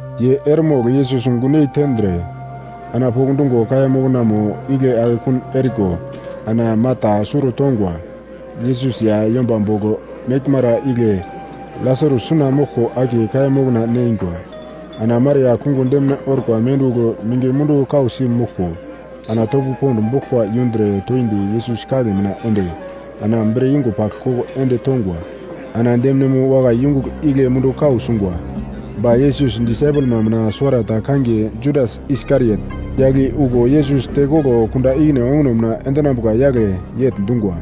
Ye eremogl Yesus gunyei tendre, ana pokndungo kaiya moknamo igle akekun eriko ana Marta suro tongwa. Yesus ya yomba bogl meglmara igle Lasarus suna moglko akiye kaiya mokna neingwa. Ana Maria kungo demine orkwa mendugl mingi mundu kausi moglko, ana topo pond boglkwa yundre toindi Yesus kagle mina ende, ana bre yungo pagl koko ende tongwa. Ana deminemo wakai yungugl igle mundu kau sungwa. Ba Yesus disaipelma mina suwarata kangiye Juda Iskariot, yagl i okuwo Yesus tekoglo kunda ikine onguno mina endinambuka yagle yegl dungwa,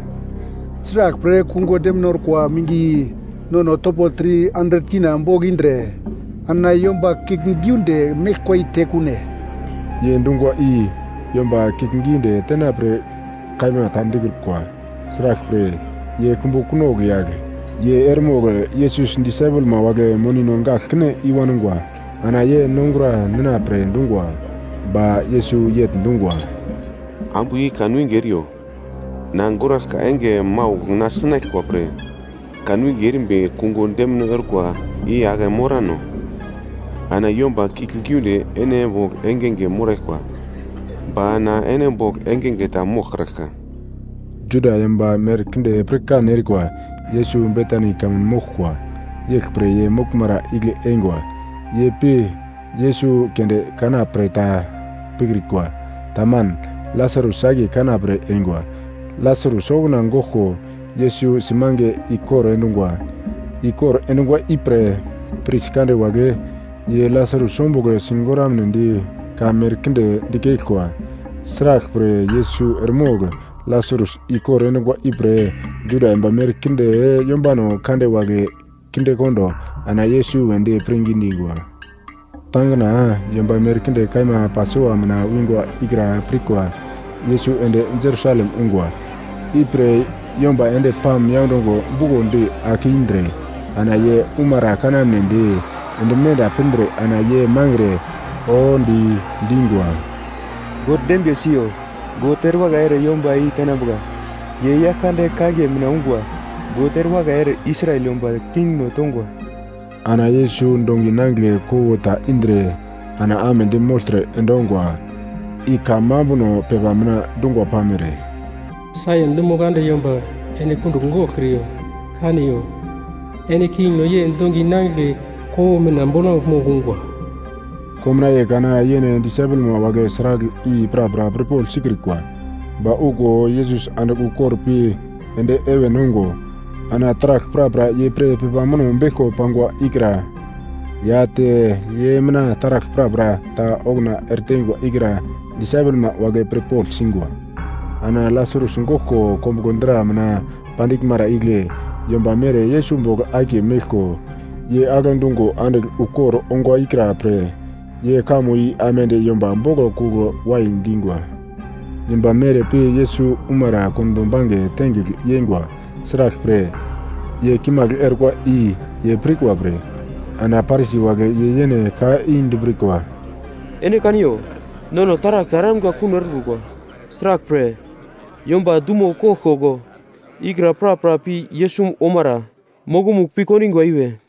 “Sraglpre kungo demine orkwa mingi i nono topo K300 bogl indre, ana yomba kiuglgiunde meglkwa i tekune?” Ye dungwa i yomba kiuglgiunde tenapre kaima ta dikrukwa. Sraglpre, ye kumbu kunogl yagl, ye eremogl Yesus disaipelma wagle monino gagl kine i-wangwa, ana ye nongura nina pre dungwa. Ba Yesus yegl dungwa, “Ambu i kanwinge eriyo! Na goraglka enge maugl na sinaglkwa pre, kanwinge erimbi kungo demine orkwa i ake morano. Ana yomba kiuglgiunde ene bogl engenge moraglkwa. Ba na ene bogl engenge ta moglkraglka.” Juda yomba merkinde pirkan erikwa, Yesus Betani kamun moglkwa. Yeglpre ye moglmara igle eingwa, ye pi Yesus keunde kana pre ta pikrikwa, taman, Lasarus akiye kana pre eingwa. Lasarus okuna goglko Yesus simange ikor endungwa. Ikor endungwa ipre, pris kande wagle ye Lasarus ombugl sigoramnedi ka merkinde dikeglkwa. Sraglpre Yesus eremogl Lasarus ikor endungwa ipre Juda yomba merkinde yombano kande wagle kindekondo ana Yesus wedi pirngi dingwa. Tangina yomba merkinde kaima Pasova mina wingwa ikra pirkwa, Yesus ende Jerusalem ungwa. Ipre yomba endi palm yaundongo bukondi ake indre ana ye umara kanamnedi ende menda pindre ana ye mangre, oodi, dingwa, “God dembiye siyo!” “God ere wakai ere yomba i tenambuka, ye Yaglkande kangiye mina ungwa!” “God ere wakai ere Israel yomba kingno tongwa!” Ana Yesus dongi nangigle kowo ta indre ana amedi mogltre endongwa, i kamambuno pepa mina dungwa pamere, “Saion dumo kande, yomba ene kundugl goglkriyo! Kaniyo, ene kingno ye dongi nangigle kowo mina bolamugl mogl ungwa.” Komnaiye kana yene disaipelma wagle sragl i prapra pirpogl sikrikwa. Ba okuwo Yesus andigl ukor pi ende heven ongo, ana taragl prapra ye pre pepa muno beglko pangwa ikra ya te ye mina taragl prapra ta okuna ereteingwa ikra disaipelma wagle pirpogl singwa. Ana Lasarus goglko kombuglo dra mina pandiglmara igle yomba mere Yesus bogl akiye meglko, ye agle dungo andigl ukor ongwa ikra pre ye kamo i aimande yomba boglo kugl wai dingwa. Yomba mere pi Yesus umara konbo bange tengigl yeingwa sraglpre, ye kimagl orkwa i ye pirkwa pre. Ana Parisi wagle ye yene ka i dipirkwa, “Ene kaniyo, nono taragl ta eramga kuno erekrukwa, sraglpre, yomba dumo koglkoglo ikra prapra pi Yesus omara mokomugl pi kondingwa i we.”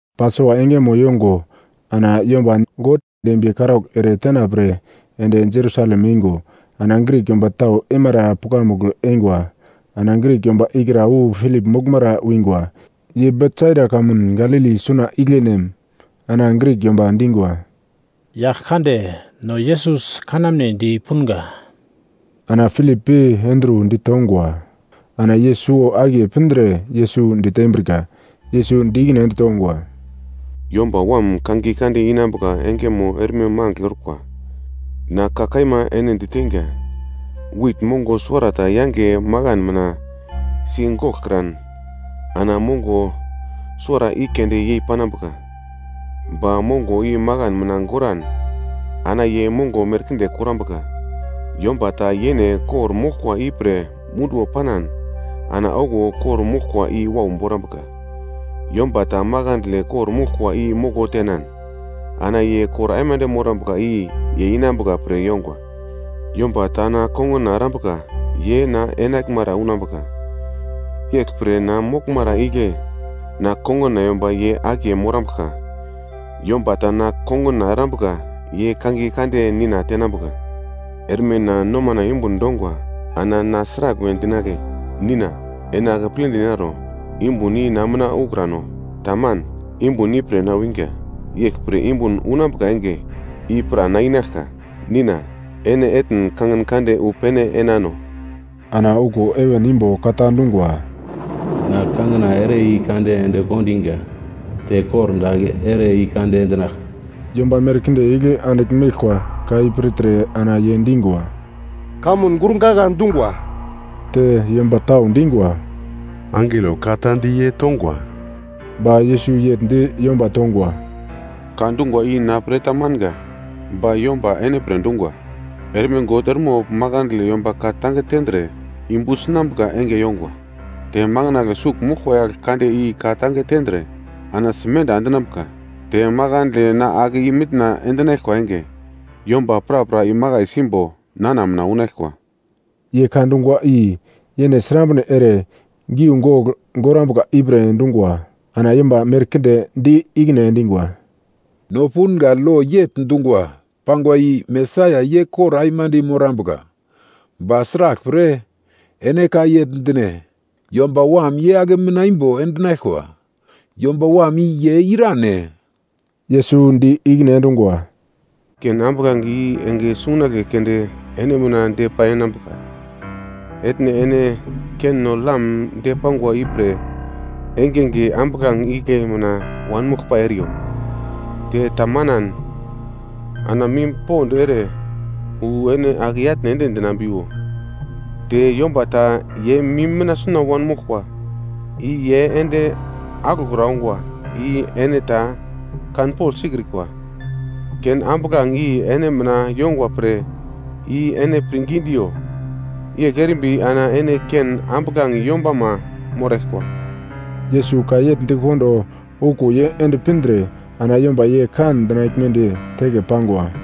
Pasova engemo yongo ana yomba God dembiye karaugl ere tena pre ende Jerusalem eingo, ana Grik yomba tau eimara pukamugl eingwa. Ana Grik yomba ikra wu Pilip moglmara wingwa, ye Betsaida kamun Galili suna igle nem. Ana Grik yomba dingwa, “Yagl kande, no Yesus kanamnedi punga.” Ana Pilip pi Andru ditongwa. Ana ye suwo-akiye pindre Yesus ditembrika. Yesus di ikine ende tongwa, “Yomba Wam kangiye kande inambuka engemo erme magl orkwa. Na ka kaima ene diteinga, wit mongo suwarata yange makan mina si goglkran ana mongo suwara i keunde yei panambuka. Ba mongo i makan mina goran ana ye mongo merkinde korambuka. Yomba ta yene kor-moglkwa ipre munduwo panan ana okuwo kor-moglkwa i wau borambuka. Yomba ta makandle kor-moglkwa i moko tenan ana ye kor aimande morambuka i ye inambuka pre yongwa. Yomba ta na konguna erambuka ye na enaglmara unambuka, yeglpre na moglmara igle na konguna yomba ye akiye morambuglka. Yomba ta na konguna erambuka ye kangiye kande Nina tenambuka. “Erme na nomana yumbun dongwa ana na sragl we dinagle? Nina, ene akepledi naro, yumbun i na mina ukrano? Taman, yumbun ipre na winga, yeglpre yumbun unambuka enge i pra na inaglka. Nina, ene etn kangin kande wu pene enano.” Ana okuwo heven imbo ka ta dungwa, “Na kangina ere i-kande ende kondiga, te kordagl ere i-kande endinaglka.” Yomba merkinde igle andigl meglkwa ka i pirtre ana ye dingwa, “Kamun gurgagla dungwa.” Te yomba tau dingwa, “Angelo ka ta di ye tongwa.” Ba Yesus yegl di yomba tongwa, “Ka dungwa i na pre tamanga ba yomba ene pre dungwa. Erme God eremogl makandle yomba ka-tange tendre yumbu sinambuka enge yongwa, te makandle sugl moglkwa yagl kande i ka-tange tendre ana simenda endinambuka. Te makandle na ake i-mitna endinaglkwa enge, yomba prapra imakai simbo nana mina unaglkwa.” Ye ka dungwa i yene srambre ere giugogl gorambuka ipre dungwa. Ana yomba merkinde di ikine endingwa, “No punga lo yegl dungwa pangwa i Mesaia ye kor aimande morambuka, ba sraglpre ene ka yegl dine, ‘Yomba Wam ye ake i-mitna imbo endinaglkwa?’ Yomba Wam i ye irane?” Yesus di ikine endungwa, “Ken ambuglange i enge sungunagle keunde ene mina depai enambuka. Etne ene kenno-lam depangwa ipre engenge ambuglange igle mina wanmoglpai eriyo, te tamanan ana mim pond ere wu ene ake i-atne ende dinambiwo, te yomba ta ye mim mina suna wanmoglkwa i ye ende aglokra ongwa i yene ta kanpogl sikrikwa. Ken ambuglange i ene mina yongwa pre i ene pirngi diyo, yegl erimbi ana ene ken ambuglange yombama moraglkwa.” Yesus ka yegl dikondo okuwo ye ende pindre, ana yomba ye kan dinaglmedi teke pangwa.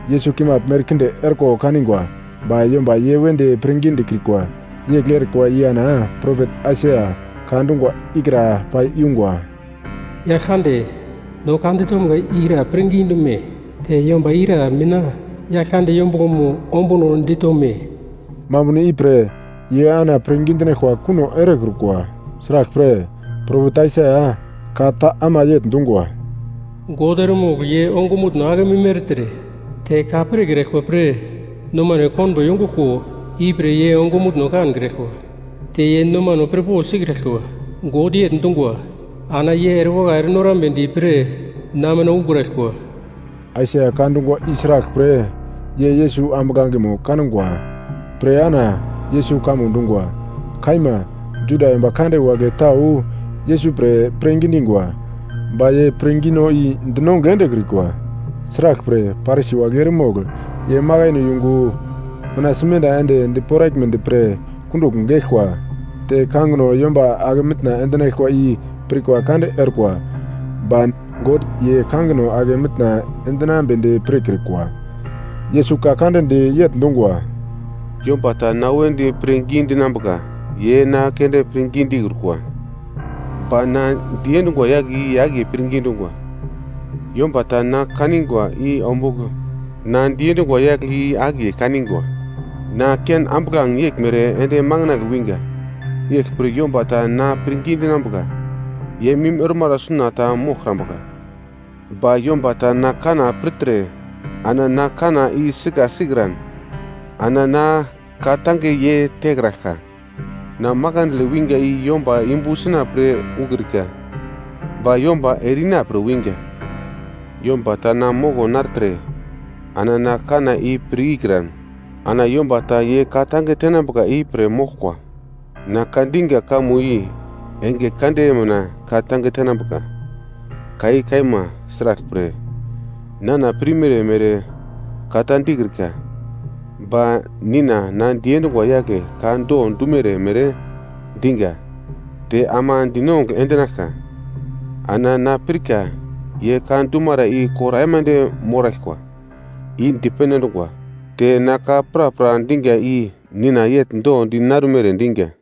Yesus kimagl merkinde orko kanigwa, ba yomba ye wedi pirngi dikrikwa. Yegl erikwa i ana propet Aisaia ka dungwa ikra pai yungwa: “Yaglkande, no ka ditomga i ira pirngi dume? Te yomba ira mina Yaglkande yombuglomo ombuno ditome?” Mambuno ipre ye ana pirngi dinaglkwa kuno erekrukwa, sraglpre, propet Aisaia ka ta ama yegl dungwa, “God eremogl ye ongumutno akemim ertre te ka pirkraglkwa pre nomano konbo yonguglko, ipre ye ongumutno kankraglkwa te ye nomano pirpogl sikraglkwa. God yegl dungwa, ana ye erewakai ere norambedi pre na mina ukraglkwa.” Aisaia ka dungwa i sraglpre, ye Yesus ambuglangemo kangwa pre ana Yesus kamo dungwa. Kaima, Juda yomba kande wagle tau Yesus pre pirngi dingwa. Ba ye pirngino i dinongugl endekrikwa, sraglpre, Parisi wagle eremogl ye makaino yungo mina simenda ende di poraglmedi pre kundugl geglkwa. Te kangino yomba ake mitna endinaglkwa i pirkwa kande orkwa, ba God ye kangino ake mitna endinambedi pirkrikwa. Yesus ka kande di yegl dungwa, “Yomba ta na wedi pre pirngi dinambuka ye na keunde pirngi dikrukwa, ba na diendungwa yagle i akiye pirngi dungwa. Yomba ta na kanigwa i ombugl na diendungwa yagle i akiye kanigwa! Na ken ambuglange yeglmere ende makandle winga. Yeglpre yomba ta na pirngi dinambuka, ye mim ormara suna ta moglkrambuka. “Ba yomba ta na kanna pirtre ana na kanna i sika sikran, ana na ka-tange ye tekraglka. Na makandle winga i yomba yumbu sina pre ukrika, ba yomba ere-ina pre winga. Yomba ta na moko nartre ana na kanna i pir ikran, ana yomba ta ye ka-tange tenambuka i pere moglkwa. Na ka dinga kamo i enge kande mina ka-tange tenambuka. Ka i kaima sraglpre, nana pirmere mere ka ta dikrika, ba Nina na diendungwa yagle ka do dumere mere dinga te ama dinongugl endinaglka. Ana na pirka ye ka dumara i kor aimande moraglkwa i dipene endungwa. Te na ka prapra dinga i Nina yegl do di narumere dinga.”